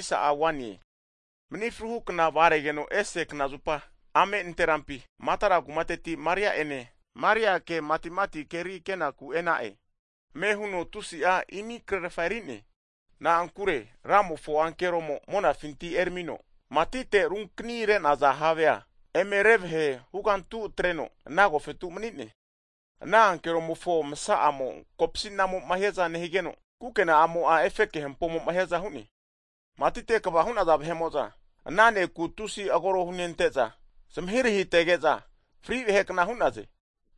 Hagi mani fruhu kna vagaregeno ese knazupa ame nanterampi, Makdala kumateti Maria ene Mariake matimati havega kenaku e'na'e. Ame huno tusi'a imikrefa erine, na'ankure Ramofo ankeromo monafinti eramino matite runkani re'naza have eme revahe hugantu atreno ana agofetu manine. Ana ankeromofo masa'amo'a kopsinamoma hiaza nehigeno, kukena'amo'a efeke hampomo'ma hiaza hu'ne. Matite kva hu'naza vahe'mo'za ana ne'ku tusi agoro hunente'za zmahiritege'za fri vahe kna hu'naze.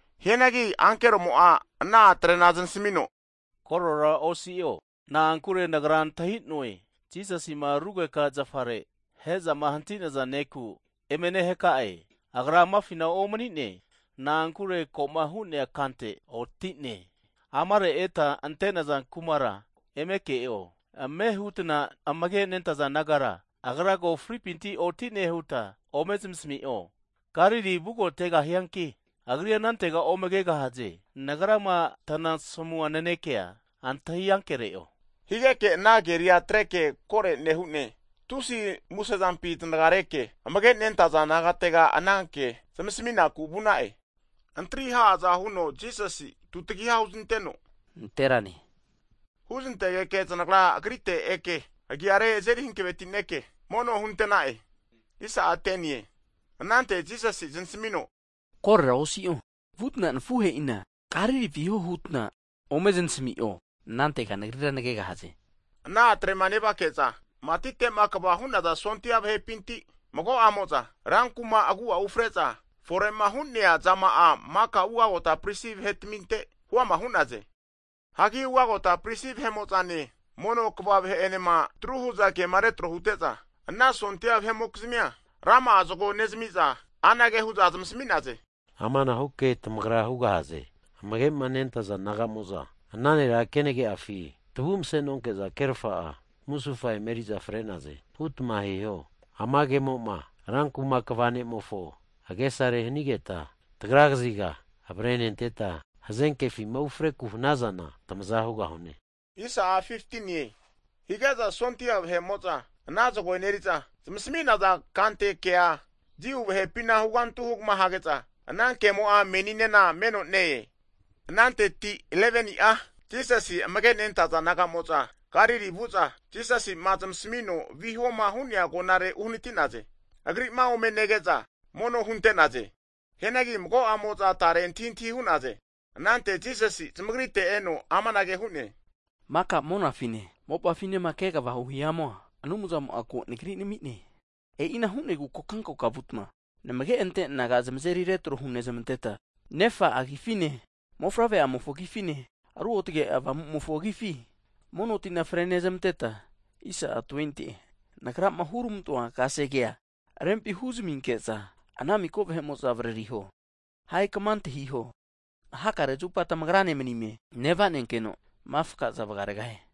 Hianagi ankeromo'a ana a'trena zanismino korora osi'o, na'ankure nagra antahinue, Jisasima rugeka zafare ahe'zama hantinaza neku eme nehaka'e. Agra amafina omanine, na'ankure koma hu'nea kante oti'ne. Amare eta avifama ante'nazafina eme ke'o. Ame' hutna amage nentaza disaipol nagara, Agra ko fripintira otine huta ome smasami'o, Galili vugotegahianki Agrira anantega ome kegahaze. Nagrama tanasamua nanekea antahi ankere'o. Higeke ana keria atreke kore nehune tusi musezampi zanagareke amage nentaza nagatega ananke zamasminaku vu'na'e. Antari ha'aza huno Jisasi'a tutagiha huznenteno, Nanterane huznantegeke, zanagra Agrite eke agiare eme azeri hanavetineke mono hunte'na'e. Anante Jisasi'a zanasmino, Korora osio, vutna nafuhe'ina Galili viho hutna ome zamismi'o. Anantega Nagrira nagegahaze. Hagi ana a'trema nevake'za matite'ma kva hu'naza sondia vahepinti, mago'amo'za rankuma agu'afi ufre'za, fore'ma hu'nea zama'a maka ugagota pristi vahetaminte huama hu'naze. Hagi vugota pristi vahe'mo'za mono kva vahe enema atru hu'za kema retro hute'za, ana sondia vahe'mokizamia rama'a zago nezamiza, anage hu'za zamasmi'naze, Amanahu ke tamagra hugahaze. Amage'ma nentaza disaipol naga'mo'za ana nera kenage'afi tavu mase'nonke'za kerfa'a musufa emeriza fre'naze, hutma hiho. Ama kemo'ma rankuma kva (Gavana) ne'mofo agesare hanigeta, tagra kaziga avrenenteta, hazenkefima ufreku hanazana tamaza hugahune. Hazage'za sondia vahe'mo'za ana zago eneri'za, zamisminaza kante kea Jiu vahepina huganti kama hazage'za ana kemo'a meninena meno ne-e. Ananteti 11ni'a Jisasi amage nentaza disaipol naga'moza Galili vu'za, Jisasi'ma zmasamino vihoma hu'nea agonare. Agri'ma ome nege'za mono hunte'naze. Hianagi mago'amo'za tare antahintahi hu'naze. Anante Jisasi zmagrite eno amanage hu'ne, Maka monafine mopafinema kegavahu hihamu'a, Anumzamo'a ko Nagri namine. E'ina hunegu kokankoka vutma, namage ante disaipol naga zamazeri retro hunezmanteta, Nefa agifine, Mofavre'amofo agifine, Ruotge Avamumofo agifi mono tina frenezamanteta, Nagrama huramantoa kasege rempi huzaminke'za ana miko vahe'mo'za avaririho. Hagi kama antahiho, Hakare zupa tamagra ne manina nevanenkeno makaza vagaregahie.